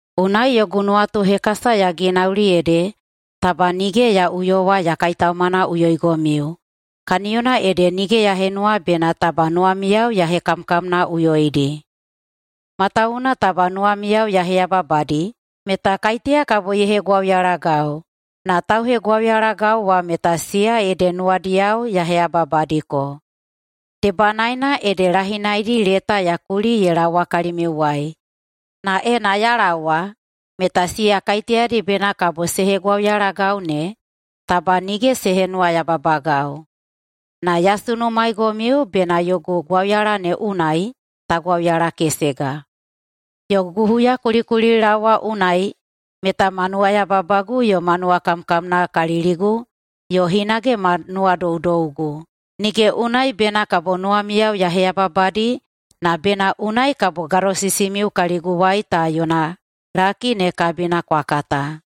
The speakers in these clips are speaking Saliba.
Unai yogu nuwatuhekasa ya ginauli ede taba nige ya uyowa ya kaitaumanaꞌuyoigomiu kaniyona ede nige ya henuwa bena taba nuwamiyao ya hekamkamnaꞌuyoidi. Matawuwuna taba nuwamiyao ya heyababadi meta kaiteya kabo ye hegwauyalagau, na tauhegwauyalagau wa meta siya ede nuwadiyao ya heyababadiko. Debanaena ede lahinaidi leta ya kuli ye laowa kalimiuwai na ena ya laowa meta siya kaiteyadi bena kabo se hegwauyalagau ne taba nige se henuwayababagau. Na ya sunumaeigomiu bena yogu gwauyala ne unai ta gwauyalakesega. Yogu huyakulikulilaowa unai meta ma nuwayababagu yo ma nuwakamkamnakaliligu yo hinage ma nuwadoudougu, nige unai bena kabo nuwamiyao ya heyababadi na bena unai kabo gadosisimiu kaliguwai ta yona laki ne kabina kwa kata.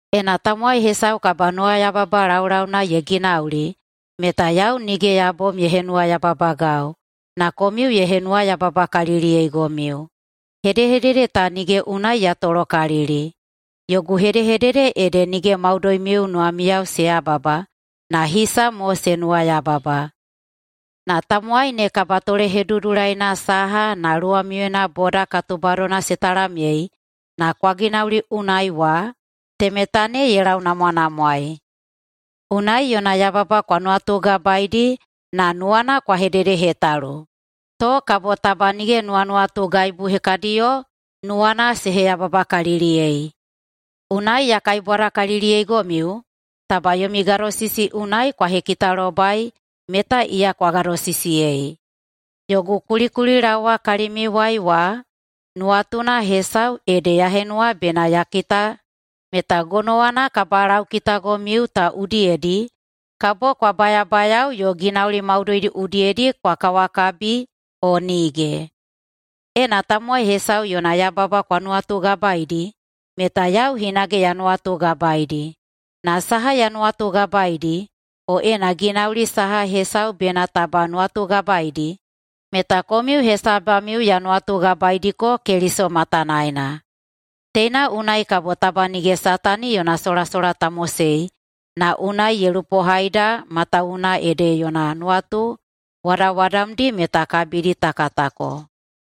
Ena tamowai hesau kabanuwayababa laulauna ye ginauli meta yau nige ya bom ye henuwayababagau na komiu ye henuwayababakaliliyeigomiu. Hedehedede ta nige unai ya tolokalili. Yogu hedehedede ede nige maudoimiu nuwamiyao se yababa na hisa mo se nuwayababa. Na tamowai ne kabatolehedudulaina saha na luwamiuyena boda katubadona se talamyei na kwa ginauli unai wa, temeta ne ye launamwanamwaei. Unai yona yababa kwa nuwatugabaeidi na nuwana kwa hededehetalu, to kabo taba nige nuwanuwatugaibu hekadiyo nuwana se heyababakaliliyei. Unai ya kaibwadakaliliyeigomiu taba yomi gadosisi unai kwa hekitalobai meta iya kwa gadosisiyei. Yogu kulikulilaowa kalimiuwai wa nuwatuna hesau ede ya henuwa bena ya kita meta gonowana kabalaukitagomiu ta udiyedi kabo kwa bayabayao yo ginauli maudoidi udiyedi kwa kawakabi o nige. Ena tamowai hesau yona yababa kwa nuwatugabaeidi meta yau hinage ya nuwatugabaeidi, na saha ya nuwatugabaeidi, o ena ginauli saha hesau bena taba nuwatugabaeidi, meta komiu hesabamiu ya nuwatugabaeidiko Keliso matanaena. Teina unai kabo taba nige Satani yona solasola ta mosei na unai ye lupohaida matawuwuna ede yona nuwatu wadawadamdi meta kabidi ta katako.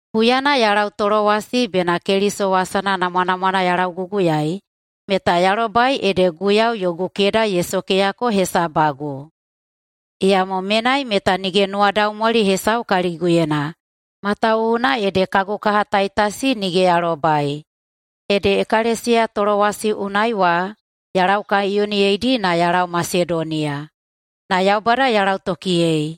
Huyana ya lau Tolowasi bena Keliso wasana namwanamwana ya lauguguyaei meta ya lobai ede Guiyau yogu keda ye sokeyako hesabagu. Iyamo menai meta nige nuwadaumwali hesau kaliguyena, matawuwuna ede kagu kaha Taitasi nige ya lobai. Ede [ekalesiya Tolowasi unai wa] ya laukaiyoniyeidi na ya lau Masedoniya. Na Yaubada ka lautokiyei.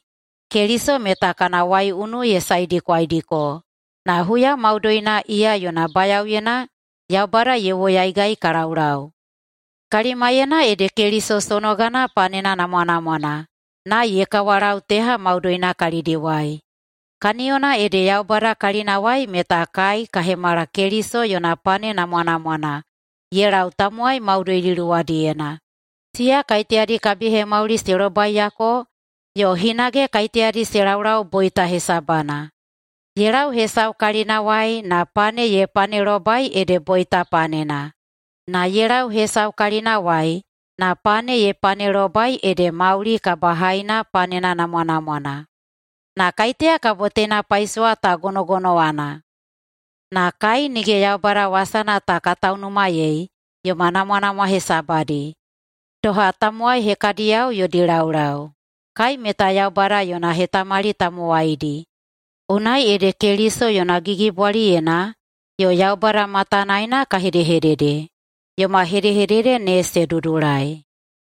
Keliso meta kana waiunu ye saedikwaidiko, na huya maudoina iya yona bayaoyena Yaubada ye woyaigai ka laulau. Kalimaiyena ede Keliso sonogana panena namwanamwana na ye kawalau teha maudoina kalidiwai. Kaniyona ede Yaubada kalinawai meta kai ka hemala Keliso yona pane namwanamwana ye lau tamowai maudoidi luwadiyena, siya kaiteyadi kabihemauli se lobaiyako yo hinage kaiteyadi se laulau boita hesabana. Ye lau hesau kalinawai na pane ye panelobai ede boita panena, na ye lau hesau kalinawai na pane ye panelobai ede mauli kabahaina panena namwanamwana. Na kaiteya kabo teina paisowa ta gonogonowana? Na kai nige Yaubada wasana ta ka taunumayei yoma namwanamwa hesabadi, doha tamowai hekadiyao yodi laulau. Kai meta Yaubada yona hetamali tamowaidi, unai ede Keliso yona gigibwaliyena yo Yaubada matanaena ka hedehedede. Yoma hedehedede ne se dudulai.